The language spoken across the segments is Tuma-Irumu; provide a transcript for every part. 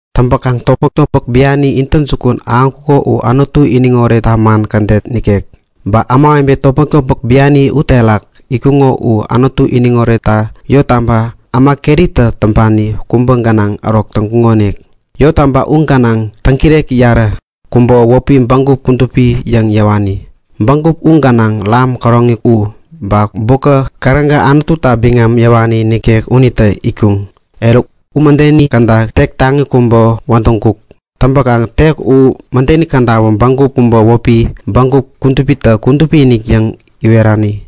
Täŋpäkaŋ topmäk-topmäk biani intäjukun ahäŋkuko u Anutu iniŋ oretta man kädet nikek. Ba ämawebe topmäk-topmäk biani uterak itkuŋo u Anutu iniŋ oretta yottaba äma keritä täŋpani kubä gänaŋ ärok täŋkuŋonik. Yottaba u gänaŋ täŋkireki yarä. Kubäwä wäpi Bägup Kudupi yäŋ yäwani. Bägup u gänaŋ topän käroŋi u, ba bukä, käräga Anututa biŋam yäwani nikek unitä itkuŋ. Eruk, u mädeni käda tek taŋi kubä wädäŋkuk. Täŋpäkaŋ tek u mädeni kädawä bägup kubä wäpi Bägup Kudupitä Kudupi-inik yäŋ iwerani.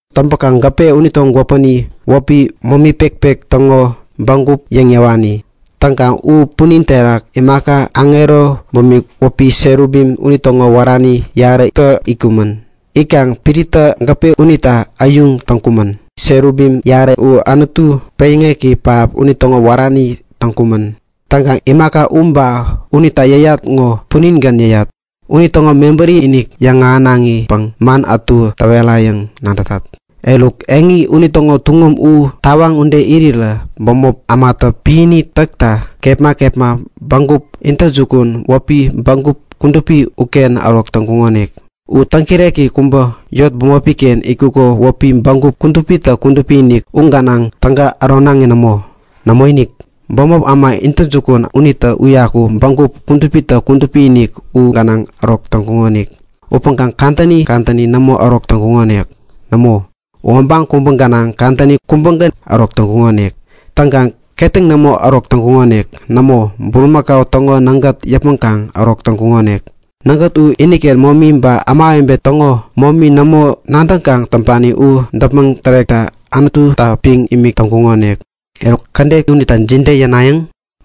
Täŋpäkaŋ gäpe unitäŋo gwäpäni wäpi momi pekpek täŋo bägup yäŋ yäwani. Täŋkaŋ u punin terak imaka aŋero bumik wäpi Serubim unitäŋo wärani yarätä itkumän. Itkaŋ piritä gäpe unita äyuŋ täŋkumän. Serubim yarä uwä Anutu peŋyäŋeki pähap unitäŋo wärani täŋkumän. Täŋkaŋ imaka u ba unita yäyat ŋo puningän yäyat. Unitäŋo mebäri-inik yäŋahänaŋipäŋ man ätu täwerayäŋ nadätat. Eruk, eŋi unitäŋo tuŋum u tawaŋ ude irirä bämop ämatä piäni täkta kepma kepma bägup intäjukun wäpi Bägup Kudupi uken ärok täŋkuŋonik. U täŋkireki kubä yot bämopi-ken itkuko wäpi Bägup Kudupitä Kudupi-inik, u gänaŋ täga äronaŋi nämo. Nämoinik, bämop äma intäjukun täŋpani unitägän Bägup Kudupitä Kudupi-inik u gänaŋ ärok täŋkukonik. Upäŋkaŋ kadäni kadäni nämo ärok täŋkukonik. Nämo, u obaŋ kubä gänaŋ kadäni kubägän ärok täŋkukonik. Täŋkaŋ ketäŋ nämo ärok täŋkukonik. Nämo, bulimakau täŋo nägät yäpmäŋkaŋ ärok täŋkukonik. Nägät u iniken momi ba ämawebe täŋo momi nämo nadäŋkaŋ täŋpani u däpmäŋ tärekta Anututa piŋ imik täŋkukonik. Eruk, kädet unita jide yänayäŋ?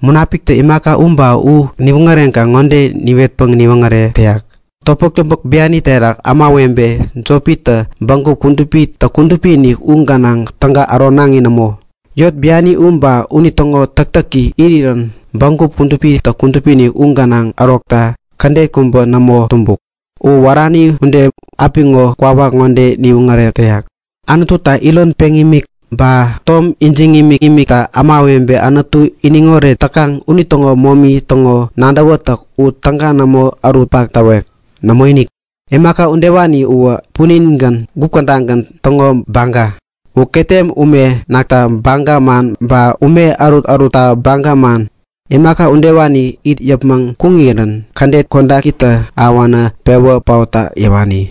Munapiktä imaka u ba u niwoŋäreŋkaŋ ŋode niwetpäŋ niwoŋärek täyak; Topmäk-topmäk biani terak ämawebe jopitä Bägup Kudupitä Kudupi-inik u gänaŋ täga äronaŋi nämo. Yot biani u ba unitäŋo täktäki irirän Bägup Kudupitä Kudupi-inik u gänaŋ ärokta kädet kubä nämo tumbuk. Uwä wärani ude apiŋo kwawak ŋode niwoŋärek täyak; Anututa iron peŋ imik, ba tom ijiŋ imikimiktä ämawebe Anutu iniŋoret täkaŋ unitäŋo momi täŋo nadäwätäk u täga nämo ärutpak täwek. Nämoinik. Imaka udewani uwä puningän, gup kädagän täŋo baga. U ketem ume nakta baga man ba ume ärut-ärutta baga man. Imaka udewani it yäpmäŋ kuŋirän kädet kodakitä ahäwänä pewä paotta yäwani.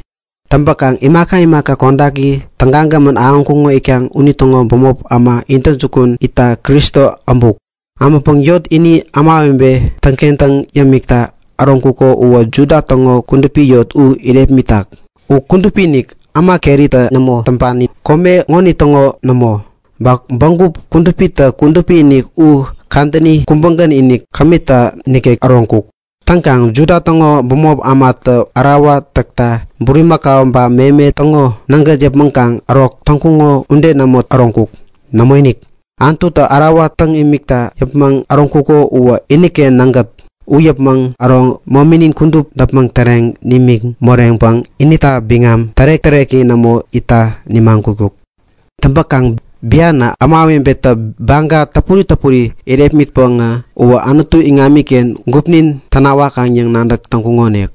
Täŋpäkaŋ imaka imaka kodaki tägagämän ahäŋkuŋo itkaŋ unitäŋo bämop äma intäjukun itta Kristo äbuk. Äbäŋpäŋ yot ini ämawebe täŋkentäŋ yämikta äroŋkuko uwä Juda täŋo kudupi yot u irepmitak. U kudupi-inik, äma keritä nämo täŋpani, kome ŋonitäŋo nämo. Ba Bägup Kudupitä Kudupi-inik u kadäni kubägän-inik, kämita nikek äroŋkuk. Täŋkaŋ Juda täŋo bämop ämatä ärawa täkta bulimakau ba meme täŋo nägät yäpmäŋkaŋ ärok täŋkuŋo ude nämo äroŋkuk. Nämoinik, Anututa ärawa täŋ imikta yäpmäŋ äroŋkuko uwä iniken nägät. U yäpmäŋ äro mominin kudup däpmäŋ täreŋ nimiŋ moreŋpäŋ inita biŋam tärek-täreki nämo itta nimagutkuk. Täŋpäkaŋ bianä ämawebetä baga täpuri täpuri irepmitpäŋä, uwä Anutu iŋamiken gupnin tänawakaŋ yäŋ nadäk täŋkuŋonik.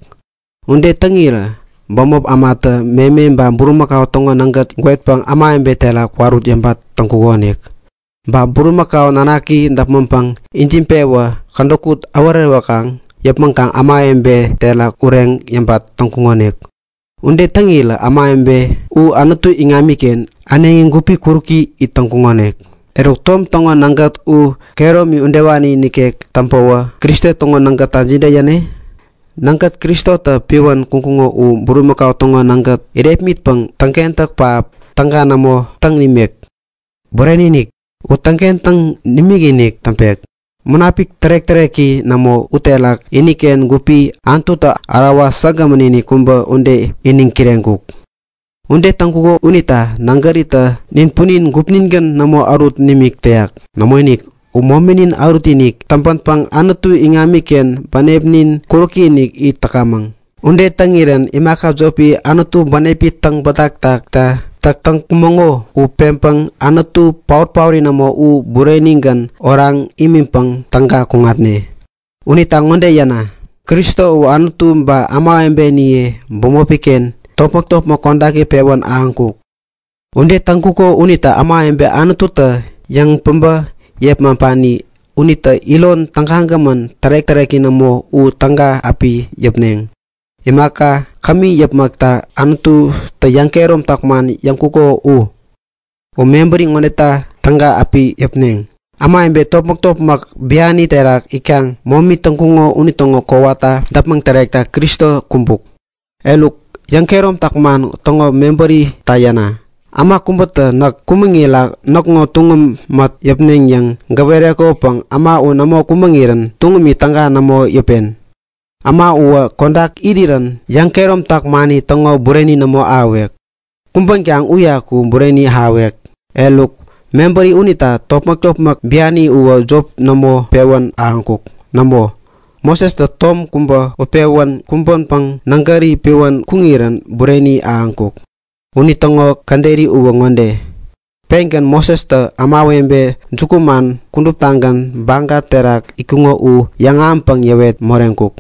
Ude täŋirä bämop ämatä meme ba bulimakau täŋo nägäri gwetpäŋ ämawebe terak kwarut yäbat täŋkuŋonik. Ba bulimakau nanaki däpmäŋpäŋ ijiŋpewä kädäkut äworewäkaŋ yäpmäŋpäŋ ämawebe terak ureŋ yäbat täŋkuŋonik. Ude täŋirä ämawebe u Anutu iŋamiken äneŋi gupi kuräki it täŋkuŋonik. Eruk tom täŋo nägät u kehäromi udewani nikek täŋpäwä Kristo täŋo nägätta jide yäne? Nägät Kristotä piwän kuŋkuŋo u bulimakau täŋo nägät irepmitpäŋ täŋkentäk pähap täga nämo täŋ nimek? Bureni-inik, u täŋkentäŋ nimikinik täŋpek. Munapik tärek-täreki nämo uterak iniken gupi Anututa ärawa säkgämän-inik kubä ude iniŋ kireŋkuk. Ude täŋkuko unita nägäritä nin punin gupningän nämo ärut nimik täyak. Nämoinik, u mominin ärutinik täŋpänpäŋ Anutu iŋamiken bänepnin kuräki-inik it täkamäŋ. Ude täŋirän imaka jopi Anutu bänepi täŋbätak täkta täk täkamäŋo u peŋpäŋ Anutu paot-paori nämo u burenigän oraŋ imiŋpäŋ täga kuŋatne. Unita ŋode yäna; Kristo uwä Anutu ba ämawebeniye bämopi-ken topmäk-topmäk kodaki pewän ahäŋkuk. Ude täŋkuko unita ämawebe Anututä yäŋpäbä yepmaŋpani unitä iron tägagämän tärek-täreki nämo u täga api yäpneŋ, imaka kämi yäpmäkta Anututä yäŋkehäromtak man yäŋkuko u. U mebäri ŋodeta täga api yäpneŋ; Ämawebe topmäk-topmäk biani terak itkaŋ momi täŋkuŋo unitäŋo kowata däpmäŋ tärekta Kristo kumbuk. Eruk, yäŋkehäromtak man täŋo mebärita yäna. Äma kubätä näk kumäŋira näkŋo tuŋum mät yäpen yäŋ gäwerekopäŋ äma u nämo kumäŋirän tuŋumi täga nämo yäpen. Äma uwä kodak irirän yäŋkehäromtak mani täŋo bureni nämo ahäwek. Kumbänkaŋ uyaku bureni ahäwek. Eruk, mebäri unita topmäk-topmäk biani uwä jop nämo pewän ahäŋkuk. Nämo, Mosestä tom kubä utpewän kumbänpäŋ nägäri piwän kuŋirän bureni ahäŋkuk. Unitäŋo käderi uwä ŋode; Pengän Mosestä ämawebe jukuman kuduptagän baga terak itkuŋo u yäŋahäŋpäŋ yäwet moreŋkuk.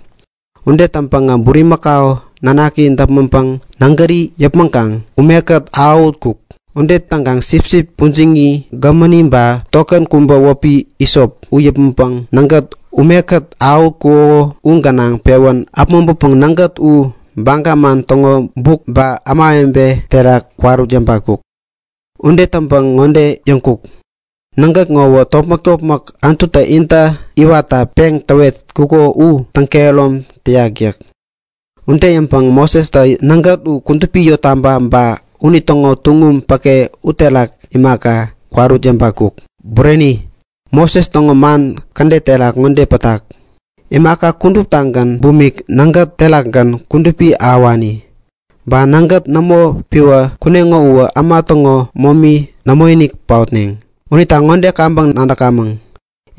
Ude täŋpäŋä bulimakau nanaki däpmäŋpäŋ nägäri yäpmäŋkaŋ umekät awähutkuk. Ude täŋkaŋ sipsip pujiŋi gämäni ba tokän kubä wäpi hisop u yäpmäŋpäŋ nägät umekät awähutkuko u gänaŋ pewän äpmoŋpäpäŋ nägät u baga man täŋo buk ba ämawebe terak kwarut yäbatkuk. Ude täŋpäŋ ŋode yäŋkuk; Nägät ŋowä topmäk-topmäk Anututä intä iwatta peŋ täwetkuko u täŋkehärom täyak yäk. Ude yäŋpäŋä Mosestä nägät u kudupi yottaba, ba unitäŋo tuŋum päke uterak imaka, kwarut yäbatkuk. Bureni, Moses täŋo man kädet terak ŋode pätak; Imaka kuduptagän bumik nägät terakgän kudupi ahäwani. Ba nägät nämo piwä kuneŋo uwä äma täŋo momi nämoinik paotneŋ. Unita ŋode kaŋpäŋ nadäkamäŋ;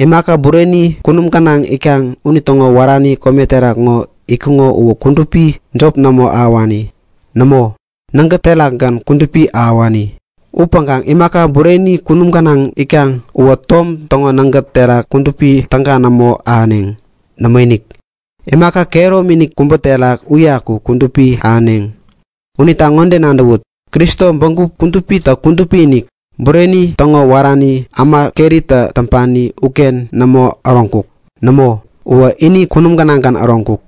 Imaka bureni kunum gänaŋ itkaŋ unitäŋo wärani kome terak ŋo itkuŋo uwä kudupi jop nämo ahäwani. Nämo, nägät terakgän kudupi ahäwani. Upäŋkaŋ imaka bureni kunum gänaŋ itkaŋ uwä tom täŋo nägät terak kudupi täga nämo ahäneŋ. Nämoinik, imaka kehäromi-inik kubä terak uyaku kudupi ahäneŋ. Unita ŋode nadäwut; Kristo Bägup Kudupitä Kudupi-inik, bureni täŋo wärani, äma keritä täŋpani uken nämo äroŋkuk. Nämo, uwä ini kunum gänaŋgän äroŋkuk.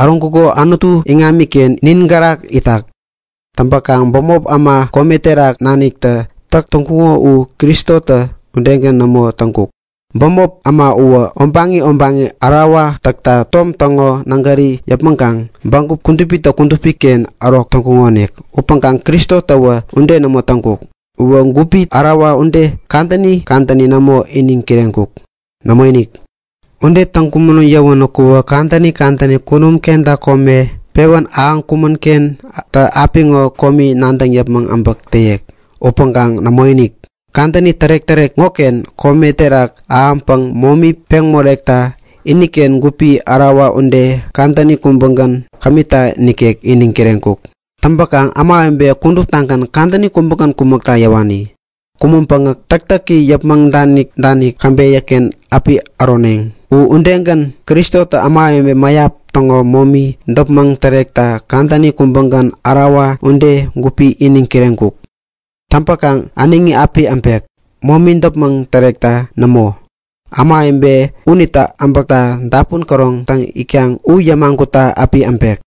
Äroŋkuko Anutu iŋamiken nin gärak itak. Täŋpäkaŋ bämop äma kome terak naniktä täk täŋkuŋo u Kristotä udegän nämo täŋkuk. Bämop äma uwä obaŋi obaŋi ärawa täkta tom täŋo nägäri yäpmäŋkaŋ Bägup Kudupitä Kudupi-inik-ken ärok täŋkukonik. Upäŋkaŋ Kristotäwä ude nämo täŋkuk. U gupi ärawa ude kadäni kadäni nämo iniŋ kireŋkuk. Nämoinik, ude täŋkuk yäwänäku kadäni kadäni kunum kenta kome pewän ahäŋkuŋ-kentä apiŋo komi nadäŋ yäpmäŋ äbäk täyek. Upäŋkaŋ nämoinik! Kadäni tärek-tärek ŋoken kome terak ahäŋpäŋ momi peŋ morekta iniken gupi ärawa ude kadäni kubägän, kämita nikek iniŋ kireŋkuk. Täŋpäkaŋ ämawebe kuduptagän kadäni kubägän kumäkta yäwani. Kumäŋpäŋä täktäki yäpmäŋ danik-danik käbeyä-ken api äroneŋ. U udegän Kristotä ämawebe mäyap täŋo momi däpmäŋ tärekta kadäni kubägän ärawa ude gupi iniŋ kireŋkuk. Täŋpäkaŋ äneŋi api äbek. Momi däpmäŋ tärekta nämo, ämawebe unitä äbäkta dapun käroŋ täŋ itkaŋ u yämagutta api äbek.